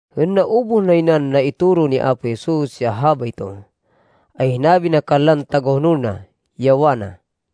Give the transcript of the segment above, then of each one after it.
Hên naubuh nay nan naitoro ni Apo Jesus ya habayto, ay hinabi na kanlan tagahonol na, ya wana,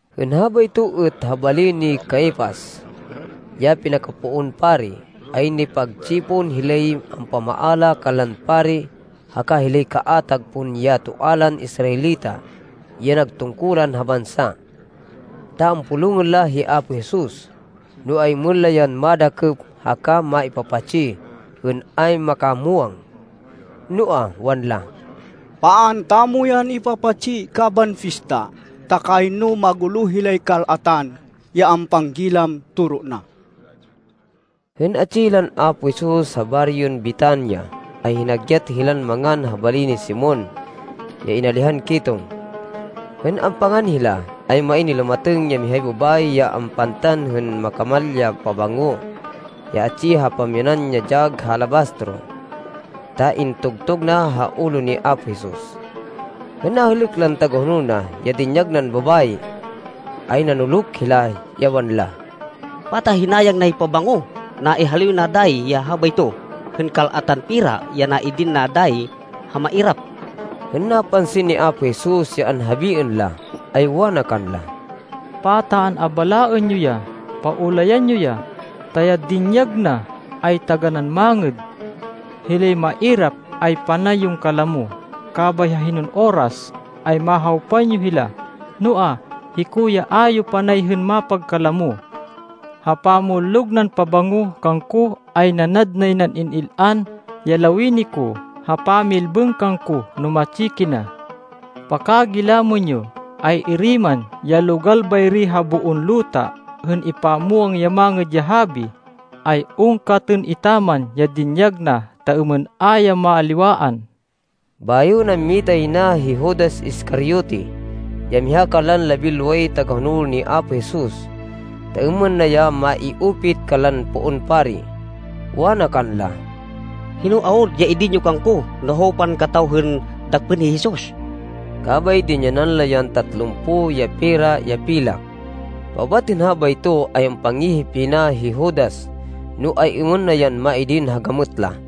Hên habayto êt ha bali ni Caifas, ya pinakapoon pari, ay nipagtsipon hilay ampamaala kanlan pari haka hilay kaatag pon ya toa lan Israelita ya nag tungkulan ha bansa. Ta ampulungên la hi Apo Jesus, no ay-êmên la yan madakêp haka maipapatsi hên ayn makamwang. Noa, wanla, “Paan tamo yan ipapatsi kaban pista, ta kayno magulo hilay kal-atan, ya ampanggilam toro na.” Hên atsi hilan Apo Jesus ha baryon Betania, ay hinagyat hilan mangan ha bali ni Simon ya inalihan ketong. Hên ampangan hila, ay main nilumatêng ya mihay babayi ya ampantan hên makamal ya pabango ya atsi ha pamyanan ya dyag ha alabastro, ta intugtug na ha ulo ni Apo Jesus. Hên nahêlêk lan tagahonol na ya dinyag nan babayi, ay nanuluk hila, ya wanla, “Pata hinayang nay pabango! Naihaliw na dayi ya habayto hên kal-atan pera ya naidin na dayi ha mairap!” Hên napansin ni Apo Jesus ya anhabiên la, ay wana kanla, “Pata an-abalaên yo ya! Paulayan yo ya, ta ya dinyag na, ay taganán mangêd. Hilay mairap ay panay yon kalamo, kabay ha hinon oras, ay mahawpan yo hila, noa, hiko ay a yo panay hên mapagkalamo. Ha pamullog nan pabango kangko, ay nanad nay nan in-il-an ya lawini ko ha pamilbêng kangko no matsi kina. Pakagilamên yo, ay-iri man ya logal bayri ha boon luta hên ipamwang ya Mangêd ya Habi, ay ungkatên etaman ya dinyag na ta êmên a ya maliwaan.” Bayo nammita yay na hi Judas Iscariote, ya miha kanlan labinloway tagahonol ni Apo Jesus, ta êmên na ya mai-upit kanlan poon pari. Wana kanla, “Hino awud ya idin yo kangko no hawpan kataw hên dakpên hi Jesus?” Kabay dinyanan la yan tatlumpo ya pera ya pilak. Paubat hên habayto, ay ampangihip yay na hi Judas no ay-êmên na yan maidin ha gamêt la.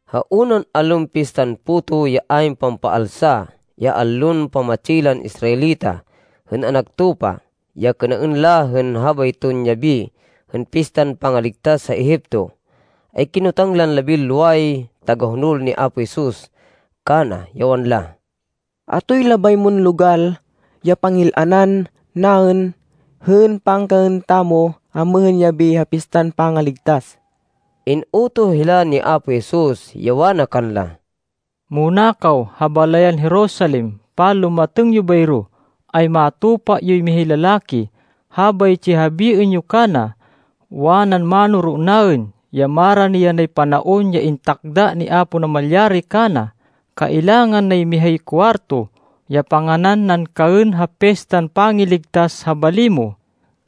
Ha unan allon Pistan Puto ya ayn Pampaalsa, ya allon pamatsi lan Israelita hên anak tupa, ya kênaên la hên habayton yabi hên Pistan Pangaligtas ha Egipto, ay kinotang lan labinloway tagahonol ni Apo Jesus, kana, ya wanla, “Atoy labay moy logal ya pangil-anan naên hên pangkaên tamo amêhên yabi ha Pistan Pangaligtas?” In-utoh hila ni Apo Jesus ya wana kanla, “Muna kaw ha balayan Jerusalem. Panlumatêng yo bayro, ay matupa yoy mihay lalaki. Habaytsi ya habiên yo kana, ‘Wanan Mánoro naên ya marani yanay panaon ya intakda ni Apo Namalyari kana. Kailangan nay mihay kuwarto ya panganan nan kaên ha Pistan Pangaligtas ha bali mo,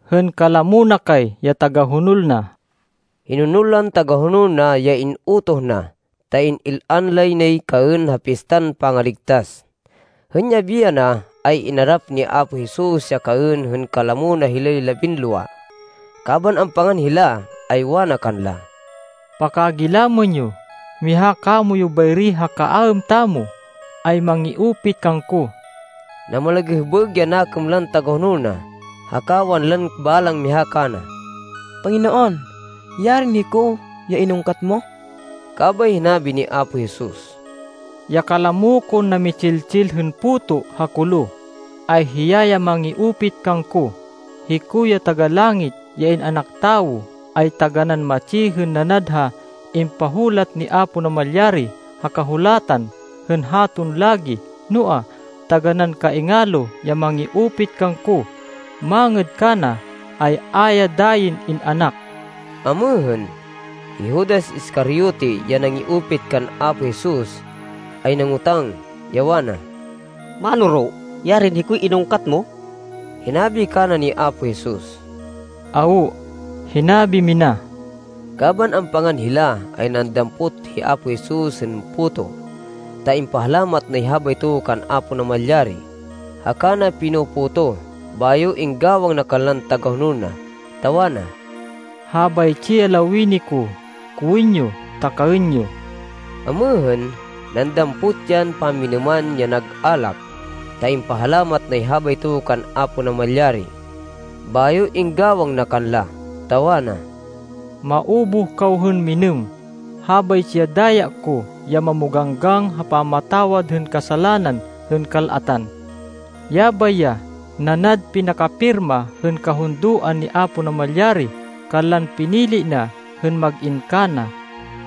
hên kalamo na kay ya tagahonol na.’” Hinonol lan tagahonol na ya in-utoh na, ta in-il-an lay nay kaên ha Pistan Pangaligtas. Hên yabi yana, ay inarap ni Apo Jesus ya kaên hên kalamo na hilay labinlowa. Kaban ampangan hila, ay wana kanla, “Pakagilamên yo, miha kamoyu bayri ha kaaêm tamo, ay mangi-upit kangko.” Namalagêhbêg ya nakêm lan tagahonol na, haka wanlan balang miha kana, “Panginoon, yarin hiko ya inungkat mo!” Kabay hinabi ni Apo Jesus, “Ya kalamo kon nami-tsil-tsil hên puto ha kolo, ay hiya ya mangi-upit kangko. Hiko ya Taga-Langit, ya In-anak Tawo ay taganán matsi hên nanad ha impahulat ni Apo Namalyari ha Kahulatan hên haton lagi. Noa, taganán kaingalo ya mangi-upit kangko. Mangêd kana, ay a ya dayin in-anak.” Amêhên, hi Judas Iscariote, ya nangi-upit kan Apo Jesus, ay nangotang, ya wana, “Mánoro, yarin hikoy inungkat mo!” Hinabi kana ni Apo Jesus, “Awo, hinabi mina.” Kaban ampangan hila, ay nandampot hi Apo Jesus hên puto ta impahalamat nay habayto kan Apo Namalyari, haka na pino-potoh, bayo inggawang na kanlan tagahonol na, ta wana, “Habaytsi ya lawini ko, kowên yo ta kaên yo.” Amêhên, nandampot yan pamminêman ya nag alak ta impahalamat nay habayto kan Apo Namalyari. Bayo inggawang na kanla, ta wana, “Maubuh kaw hên minêm. Habaytsi ya daya ko, ya mamoganggang ha pamatawad hên kasalanan hên kal-atan. Yabay ya nanad pinakapirma hên kahundoan ni Apo Namalyari kanlan pinili na hên mag-in kana.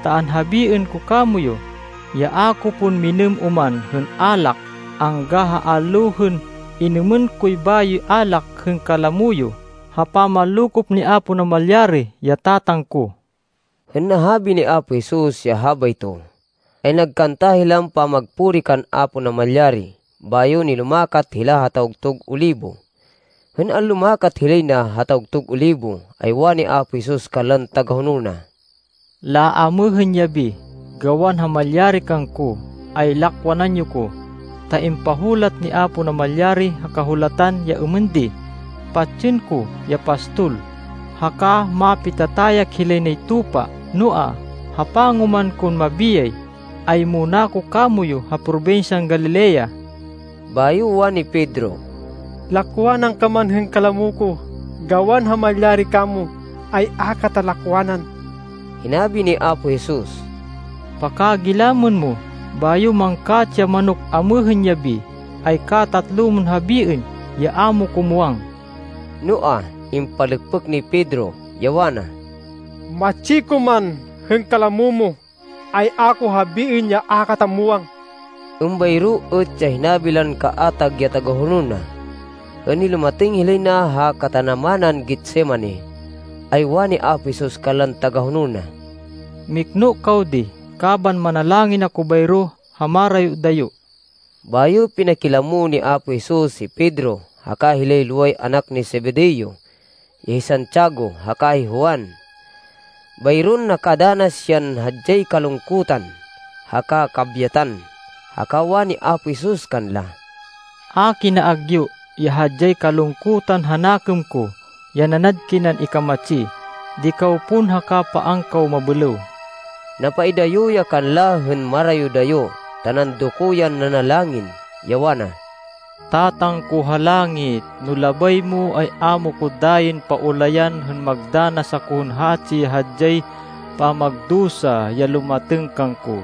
Ta anhabiên ko kamoyu, ya a ko pon minêm oman hên alak, angga ha allo hên inumên koy bayoy alak hên kalamo yo ha pamanlokop ni Apo Namalyari, ya Tatang ko.” Hên nahabi ni Apo Jesus ya habayto, ay nagkanta hilan pamagpuri kan Apo Namalyari bayo nilumakat hila ha Tawgtug Olibo. Hên anlumakat hilay na ha Tawgtug Olibo, ay wani Apo Jesus kanlan tagahonol na, “Laamêhên yabi, gawan ha malyari kangko, ay lakwanan yo ko, ta impahulat ni Apo Namalyari ha Kahulatan, ya êmên di, ‘Patsên ko ya pastol, haka mapitatayak hilay nay tupa.’ Noa, ha pangoman kon mabiyay, ay muna ko kamoyu ha probinsyan Galilea.” Bayo wani Pedro, “Lakwanan ka man hên kalamo ko, gawan ha malyari kamo, ay a kata lakwanan.” Hinabi ni Apo Jesus, “Pakagilamên mo, bayo mangkatsi ya manok, amêhên yabi, ay katatlo mon habiên ya a mo ko muwang.” Noa, impalêkpêk ni Pedro, ya wana, “Matsi ko man hên kalamo mo, ay a ko habiên ya a kata muwang.” Êmbayro êt ya hinabi lan kaatag ya tagahonol na. Hên nilumatêng hilay na ha katanamanan Getsemani, ay wani Apo Jesus kanlan tagahonol na, “Mikno kaw di kaban manalangin ako bayro ha marayo-dayo.” Bayo pinakilamo ni Apo Jesus hi Pedro, haka hilay loway anak ni Zebedeo, ya hi Santiago haka hi Juan. Bayron nakadanas yan hadyay kalungkutan haka kabyatan. Haka wani Apo Jesus kanla, “A kina agyu ya hadyay kalungkutan ha nakêm ko, ya nanad kinan ikamatsi. Di kaw pon haka paan kaw mabêlêw.” Napaidayo ya kanla hên marayo-dayo ta nandoko yan nanalangin, ya wana, “Tatang ko ha langit, no labay mo, ay a mo ko dayin paulayan hên magdanas ako hên hatsi ya hadyay pamagdusa ya lumatêng kangko.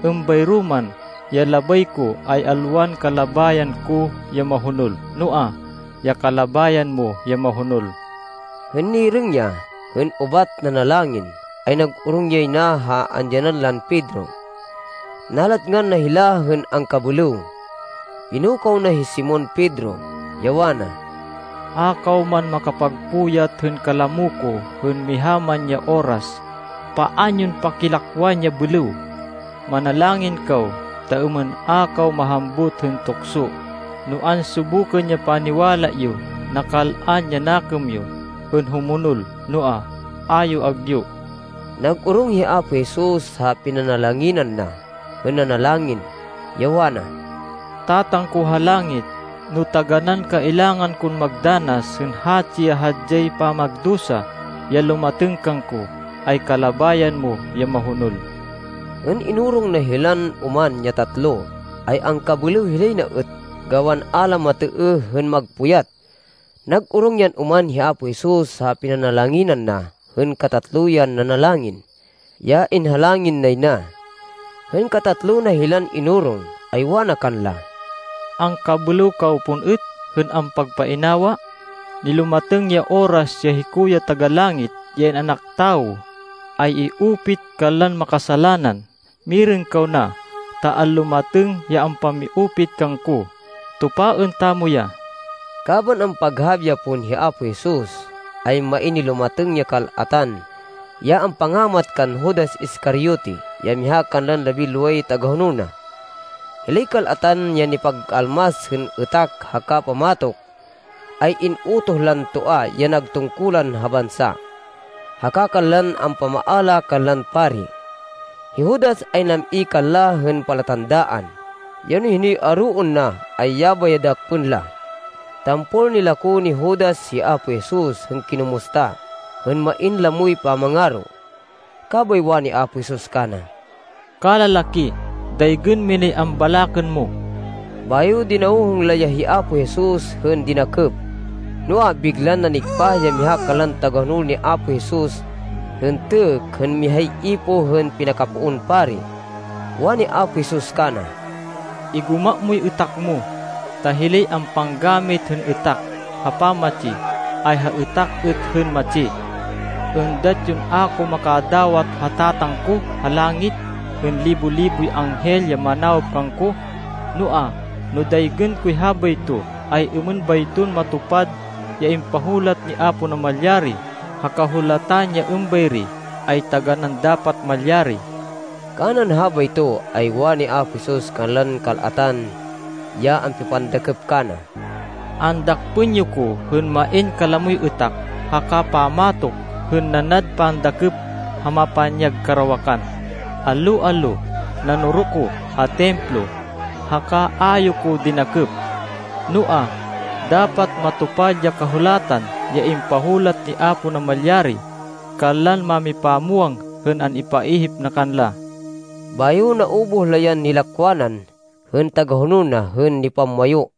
Êmbayro man ya labay ko, ay alwan kalabayan ko ya mahonol, noa, ya kalabayan mo ya mahonol.” Hên nirêng ya, hên ubat nanalangin, ay nag-orong yay na ha andyanan lan Pedro. Nalatngan na hila hên angkabêlêw. Pinukaw na hi Simon Pedro, ya wana, “A kaw man makapagpuyat hên kalamo ko hên miha man ya oras? Paan yon pakilakwan ya bêlêw. Manalangin kaw, ta êmên a kaw mahambut hên tukso no ansubukên ya paniwala yo. Nakal-an ya nakêm yo hên humonol, noa, a yo agyu.” Nag-orong hi Apo Jesus ha pinanalanginan na, hên nanalangin, ya wana, “Tatang ko ha langit, no taganán kailangan kon magdanas hên hatsi ya hadyay pamagdusa ya lumatêng kangko, ay kalabayan mo ya mahonol.” Hên inorong na hilan oman ya tatlo, ay angkabêlêw hilay na êt gawan a la matêêh hên magpuyat. Nag-orong yan oman hi Apo Jesus ha pinanalanginan na hên katatlo yan nanalangin, ya inhalangin nay na. Hên katatlo na hilan inorong, ay wana kanla, “Angkabêlêw kaw pon êt hên ampagpainawa! Nilumatêng ya oras ya hiko ya Taga-Langit, ya In-anak Tawo, ay i-upit kanlan makasalanan! Mirêng kaw na, ta anlumatêng ya ampami-upit kangko. Tupaên tamo ya!” Kaban ampaghabi ya pon hi Apo Jesus, ay main nilumatêng ya kal-atan ya ampangamat kan Judas Iscariote ya miha kanlan labinloway tagahonol na. Hilay kal-atan ya nipag-almas hên êtak haka pamatok, ay in-utoh lan toa ya nag tungkulan ha bansa, haka kanlan ampamaala kanlan pari. Hi Judas ay nam-i kanla hên palatandaan, ya no hinoy aroên na, ay yabay ya dakpên la. Tampol nilako ni Judas hi Apo Jesus hên kinumusta hên main lamoy pamangaro. Kabay wani Apo Jesus kana, “Kalalaki, daygên minay ambalakên mo.” Bayo dinawhong la ya hi Apo Jesus hên dinakêp. Noa, biglan nanigpah ya miha kanlan tagahonol ni Apo Jesus, hên têkk hên mihay ipoh hên pinakapoon pari. Wani Apo Jesus kana, “Igoma moy êtak mo, ta hilay ampanggamit hên êtak ha pamatsi, ay ha êtak êt hên matsi. Êndat yon a ko makadawat ha Tatang ko ha langit hên libo-liboy anghel ya manawop kangko! Noa, no daygên koy habayto, ay êmên bayton matupad ya impahulat ni Apo Namalyari ha Kahulatan ya êmbayri ay taganán dapat malyari!” Kanan habayto, ay wani Apo Jesus kanlan kal-atan ya ampipandakêp kana, “Andakpên yo ko hên main kalamoy êtak haka pammatok hên nanad pandakêp ha mapanyag karawakan. Allo-allo nanoro ko ha Templo, haka a yo ko dinakêp. Noa, dapat matupad ya Kahulatan ya impahulat ni Apo Namalyari kanlan mámipamwang hên an-ipaihip na kanla.” Bayo naubuh la yan nilakwanan hên tagahonol na hên nipamwayu.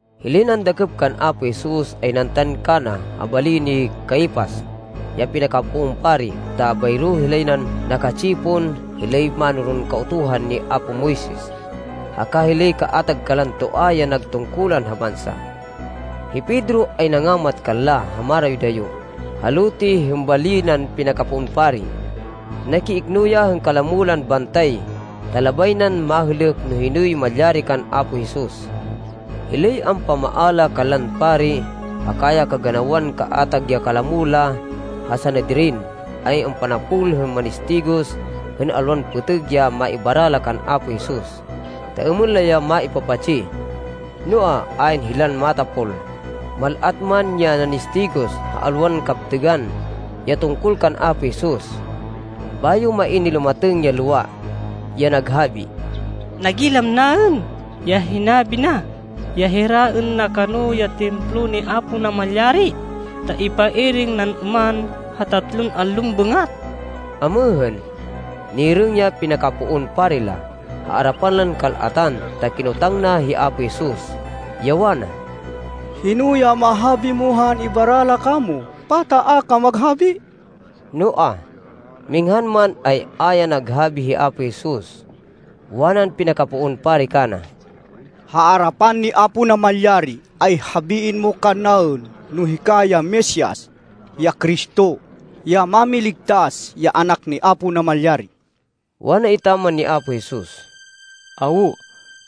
Hilay nandakêp kan Apo Jesus, ay nantan kana ha bali ni Caifas, ya pinakapoon pari ta bayro hilay nan naka-tsipon hilay mánoron Kautuhan ni apo Moises, haka hilay kaatag kanlan toa ya nag tungkulan ha bansa. Hi Pedro ay nangamat kanla ha marayo-dayo ha lote hên bali nan pinakapoon pari. Nakiikno ya hên kalamo lan bantay ta labay nan mahêlêk no hinoy malyari kan Apo Jesus. Hilay ampamaala kanlan pari haka ya kaganawan kaatag ya kalamo la ha Sanedrin, ay ampanapol hên manistigos hên alwan pêtêg ya maibara la kan Apo Jesus, ta êmên la ya maipapatsi. Noa, ayn hilan matapol, mal-at man ya nanistigos ha alwan kaptêgan ya tungkol kan Apo Jesus. Bayo main nilumatêng ya lowa, ya naghabi, “Nagilam naên ya hinabi na ya hiraên na kano ya Templo ni Apo Namalyari, ta ipairêng nan oman ha tatlon allon bêngat.” Amêhên, nirêng ya pinakapoon pari la ha arapan lan kal-atan ta kinotang na hi Apo Jesus, ya wana, “Hino ya mahabi mo ha an-ibara la kamo? Pata a ka maghabi?” Noa, minghan man, ay a ya naghabi hi Apo Jesus. Wanan pinakapoon pari kana, “Ha arapan ni Apo Namalyari, ay habiên mo kannaên no hika ya Mesias, ya Cristo, ya Mámiligtas, ya Anak ni Apo Namalyari.” Wana etaman ni Apo Jesus, “Awo,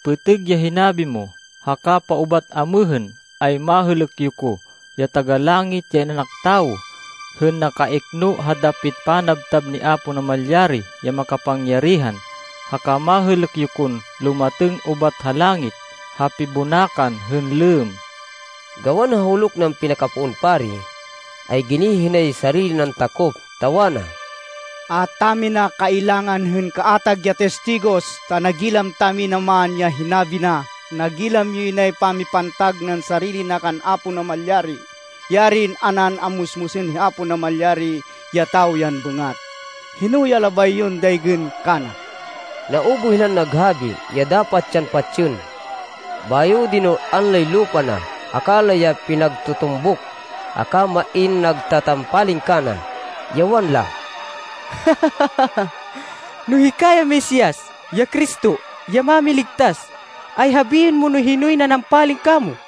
pêtêg ya hinabi mo. Haka paubat amêhên, ay mahêlêk yo ko, ya Taga-Langit ya In-anak Tawo, hên nakaikno ha dapit panabtab ni Apo Namalyari ya Makapangyarihan. Haka mahêlêk yo kon lumatêng ubat ha langit ha pibonakan hên lêmm.” Gawan huluk nan pinakapoon pari, ay ginihi nay sarili nan takop, ta wana, “A tamina kailangan hên kaatag ya tistigos, ta nagilam tamina man ya hinabi na. Nagilam yoy nay pamipantag nan sarili na kan Apo Namalyari! Yarin a nan ammusmusên hi Apo Namalyari ya tawo yan bêngat! Hino ya labay yon daygên kana?” Naubuh hilan naghabi, ya dapat yan patsên. Bayo dinul-an lay lupa na haka la ya pinagtutumbuk haka main nagtatampaling kana, ya wanla, “No hika ya Mesias, ya Cristo, ya Mámiligtas, ay habiên mo no hinoy nanampaling kamo!”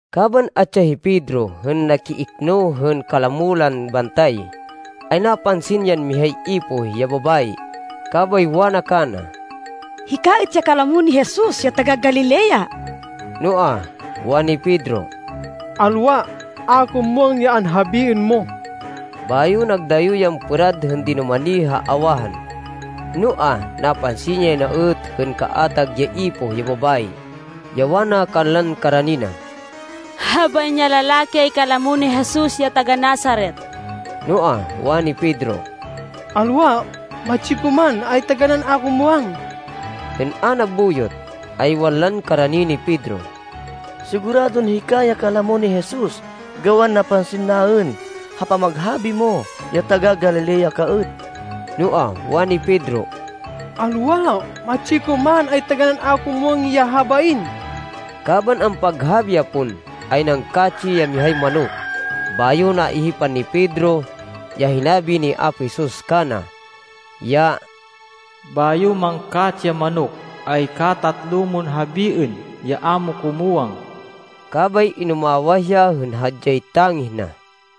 Kaban atsi ya hi Pedro hên nakiikno hên kalamo lan bantay, ay napansin yan mihay ipoh ya babayi, kabay wana kana, “Hika êt ya kalamo ni Jesus ya taga-Galilea.” Noa, wani Pedro, “Alwa. A ko muwang ya anhabiên mo.” Bayo nagdayo yan pêrad hên dinumani ha awahan. Noa, napansin yay na êt, hên kaatag ya ipoh ya babayi, ya wana kanlan karani na, “Habain ya lalaki ay kalamo ni Jesus ya taga-Nazaret.” Noa, wani Pedro, “Alwa! Matsi ko man, ay taganán a ko ya muwang!” Hên a nabuyot, ay wanlan karani ni Pedro, “Siguradon hika ya kalamo ni Jesus gawan napansin naên ha pamaghabi mo, ya taga-Galilea ka êt.” Noa, wani Pedro, “Alwa! Matsi ko man, ay taganán a ko ya muwang ya habain!” Kaban ampaghabi ya pon, ay nangkatsi ya mihay manok. Bayo naihipan ni Pedro ya hinabi ni Apo Jesus kana, ya “Bayo mangkatsi ya manok, ay katatlo mon habiên, ya a mo ko muwang.” Kabay inumawah ya hên hadyay tangih na.